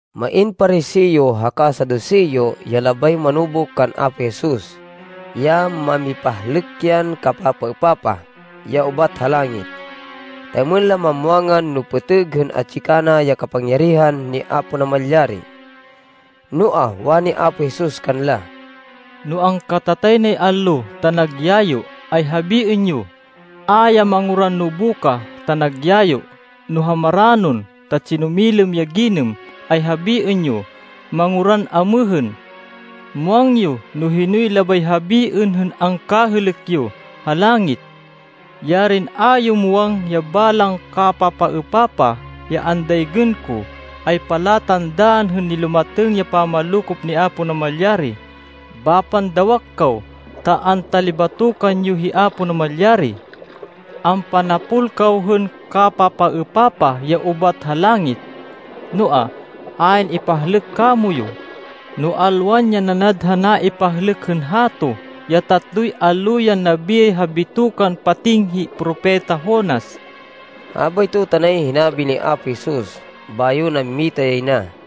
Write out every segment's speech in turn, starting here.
Main Pariseo haka Saduseo ya labay manubuk kan Apo Jesus, ya mamipahlêk yan kapapaêpapah, ya ubat ha langit, ta êmên la mamwangan no pêtêg hên atsi kana ya kapangyarihan ni Apo Namalyari. Noa, wani Apo Jesus kanla, “No angkatatay nay allo ta nag yayo, ay habiên yo, ‘A ya manguran nobukah ta nag yayo.’ No ha maranon ta tsinumilêm ya ginêm, ay habiên yo, ‘Manguran amêhên.’ Muwang yo no hinoy labay habiên hên angkahêlêk yo ha langit. Yarin a yo muwang ya balang kapapaêpapah ya andaygên ko, ay palatandaan hên nilumatêng ya pamanlokop ni Apo Namalyari! Bapan dawak kaw, ta antalibatokan yo hi Apo Namalyari. Ampanapol kaw hên kapapaêpapah ya ubat ha langit. Noa, ayn ipahlêk kamoyu, no alwan ya nanad ha naipahlêk hên hato, ya tatloy allo yan nabiyay ha bitokan pating hi Propeta Jonas.” Habayto tanay hinabi ni Apo Jesus, bayo nammita yay na.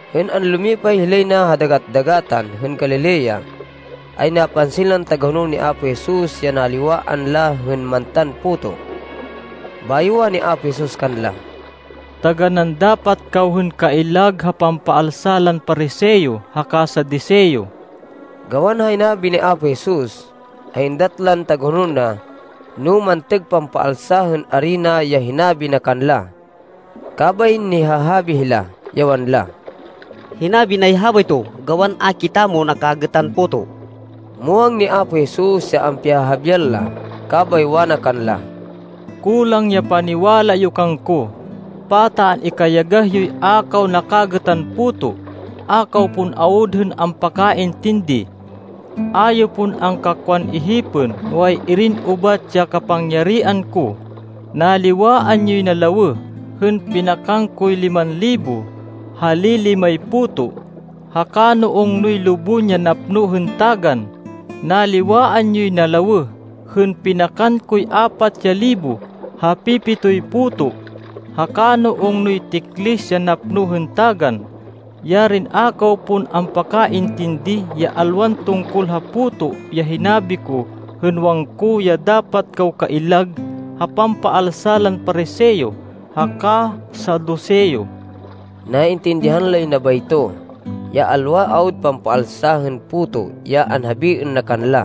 Hên anlumipay hilay na ha Dagat-dagatan hên Galilea, ay napansin lan tagahonol ni Apo Jesus ya naliwaan la hên mantan puto. Bayo wani Apo Jesus kanla, “Taganán dapat kaw hên kaillag ha pampaalsa lan Pariseo haka Saduseo.” Gawan ha hinabi ni Apo Jesus, ay êndat lan tagahonol na, no mantêg pampaalsa hên arina ya hinabi na kanla, kabay nihahabi hila, ya wanla, “Hinabi nay habayto gawan a kitamo nakagêtan puto.” Muwang ni Apo Jesus ya ampihahabian la, kabay wana kanla, “Kulang ya paniwala yo kangko! Pata an-ikayagah yoy a kaw nakagêtan puto! A kaw pon awud hên ampakaintindi! A yo pon angkakwan ihipên no ay-irin ubat ya kapangyarihan ko! Naliwaan yoy na lawêh hên pinakan koy liman libo ha li-limay puto, haka no ungnoy lubon ya napno hên tagan! Naliwaan yoy na lawêh hên pinakan koy apat ya libo ha pi-pitoy puto, haka no ungnoy tiklis ya napno hên tagan! Yarin a kaw pon ampakaintindi ya alwan tungkol ha puto ya hinabi ko hên wangko ya dapat kaw kaillag ha pampaalsa lan Pariseo haka Saduseo!” Naintindihan lay na bayto, ya alwa awud pampaalsa hên puto ya anhabiên na kanla.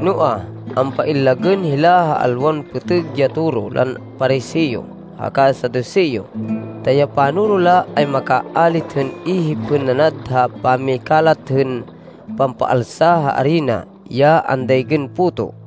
Noa, ampaillagên hila ha alwan pêtêg ya toro lan Pariseo haka Saduseo, ta ya panoro la ay makaalit hên ihip hên nanad ha pamikalat hên pampaalsa ha arina ya andaygên puto.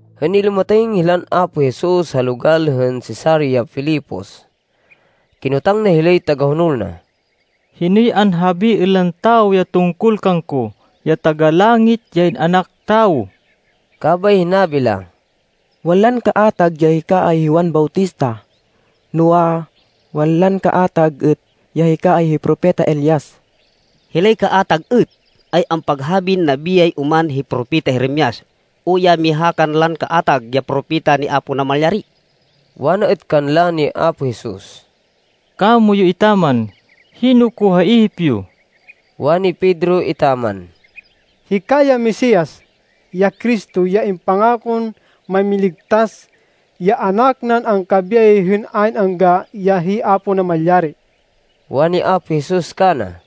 Hên nilumatêng hilan Apo Jesus ha logal hên Cesarea Filipos, kinotang na hilay tagahonol na, “Hinoy anhabiên lan tawo ya tungkol kangko, ya Taga-Langit, ya In-anak Tawo?” Kabay hinabi la, “Wanlan kaatag ya hika ay hi Juan Bautista. Noa, wanlan kaatag êt ya hika ay hi Propeta Elias. Hilay kaatag êt ay ampaghabin nabiyay oman hi Propeta Jeremias, o ya miha kanlan kaatag ya propeta ni Apo Namalyari.” Wana êt kanla ni Apo Jesus, “Kamoyu etaman, hino ko ha ihip yo?” Wani Pedro etaman, “Hika ya Mesias, ya Cristo, ya impangakon Mámiligtas, ya Anak nan angkabiyay hên ayn angga ya hi Apo Namalyari.” Wani Apo Jesus kana,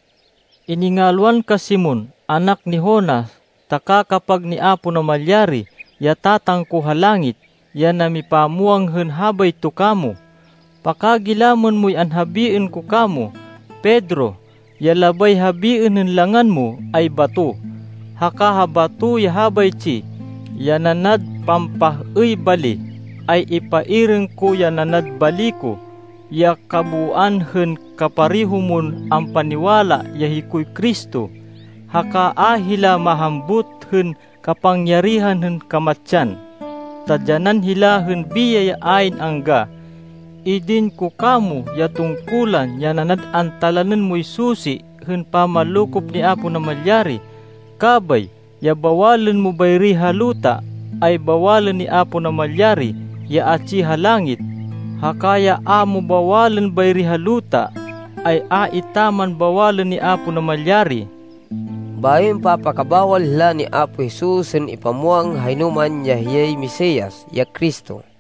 “Iningalwan ka Simon, anak ni Jonas, ta kakapag ni Apo Namalyari, ya Tatang ko ha langit, ya namipamwang hên habayto kamo. Pakagilamên moy anhabiên ko kamo, Pedro. Ya labay habiên hên langan mo ay bato. Haka ha bato ya habaytsi, ya nanad pampah-êy bali, ay ipairêng ko ya nanad bali ko, ya kabooan hên kapareho mon ampaniwala ya hikoy Cristo. Haka a hila mahambut hên kapangyarihan hên kamatsan, ta dyanan hila hên biyay ya ayn angga. Idin ko kamo ya tungkulan ya nanad antalanên moy susi hên pamanlokop ni Apo Namalyari. Kabay ya bawalên mo bayri ha luta, ay bawalên ni Apo Namalyari ya atsi ha langit, haka ya a mo bawalên bayri ha luta, ay a etaman bawalên ni Apo Namalyari.” Bayo impapakabawal hila ni Apo Jesus hên ipamwang ha hinoman ya hiyay Mesias, ya Cristo.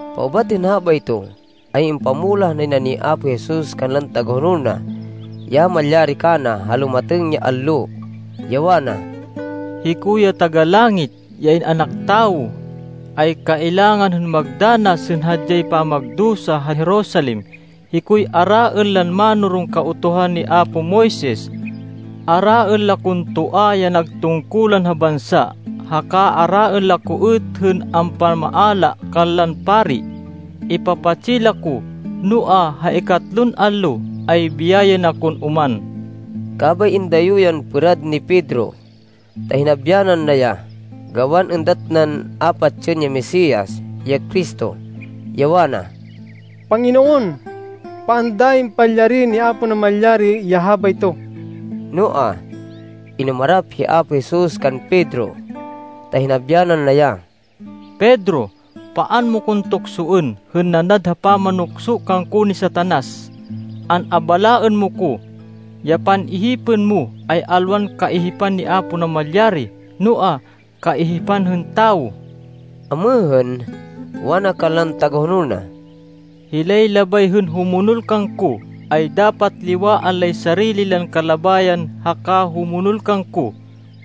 Paubat hên habayto, ay impamulah nay na ni Apo Jesus kanlan tagahonol na ya malyari kana ha lumatêng ya allo, ya wana, “Hiko ya Taga-Langit, ya In-anak Tawo, ay kailangan hên magdanas hên hadyay pamagdusa ha Jerusalem. Hikoy araên lan mánoron Kautuhan ni apo Moises. Araên la kon toa ya nag tungkulan ha bansa, haka araên la ko êt hên ampamaala kanlan pari. Ipapatsi la ko, noa, ha ikatlon allo ay biyayên akon oman.” Kabay indayo yan pêrad ni Pedro ta hinabyanan na ya, gawan êndat nan a patsên ya Mesias, ya Cristo, ya wana, “Panginoon! Paan dayi palyariên ni Apo Namalyari ya habayto!” Noa, inumarap hi Apo Jesus kan Pedro ta hinabyanan na ya, “Pedro, paan mo kon tuksoên hên nanad ha pamanukso kangko ni Satanas! An-abalaên mo ko. Ya pan-ihipên mo ay alwan kaihipan ni Apo Namalyari, noa, kaihipan hên tawo!” Amêhên, wana kanlan tagahonol na, “Hilay labay hên humonol kangko, ay dapat liwaan lay sarili lan kalabayan haka humonol kangko.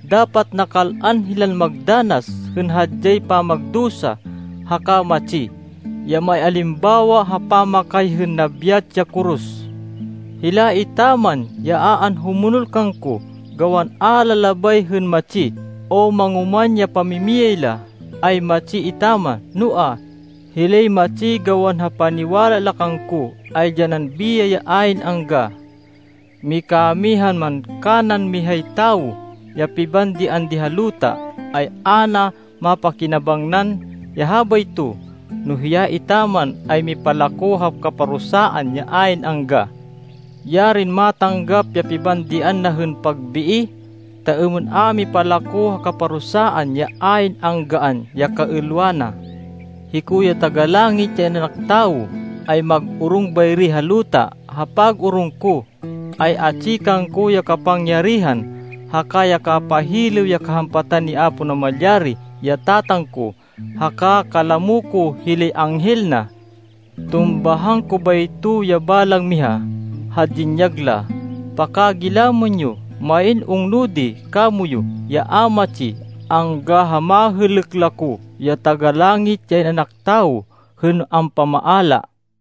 Dapat nakal-an hilan magdanas hên hadyay pamagdusa haka matsi, ya maialimbawa ha pamakay hên nabyat ya koros. Hila etaman ya a anhumonol kangko, gawan a la labay hên matsi o mangoman ya pamimiyay la, ay matsi etaman. Noa, hilay matsi gawan ha paniwala la kangko, ay dyanan biyay ya ayn angga. Mikamihan man kanan mihay tawo ya pibandian di ha luta, ay a na mapakinabangnan ya habayto, no hiya etaman ay mipalako ha kaparusaan ya ayn angga! Yarin matanggap ya pibandian na hên pagbii, ta êmên a mipalako ha kaparusaan ya ayn anggaan ya kaêlwa na! Hiko ya Taga-Langit ya In-anak Tawo, ay mag-orong bayri ha luta. Ha pag-orong ko, ay atsi kangko ya kapangyarihan haka ya kapahilêw ya kahampatan ni Apo Namalyari, ya Tatang ko, haka kalamo ko hilay anghel na. Tumbahan ko bayto ya balang miha, ha dinyag la. Pakagilamên yo! Main ungno di kamoyu ya a matsi angga ha mahêlêk la ko, ya Taga-Langit, ya In-anak Tawo, hên ampamaala.”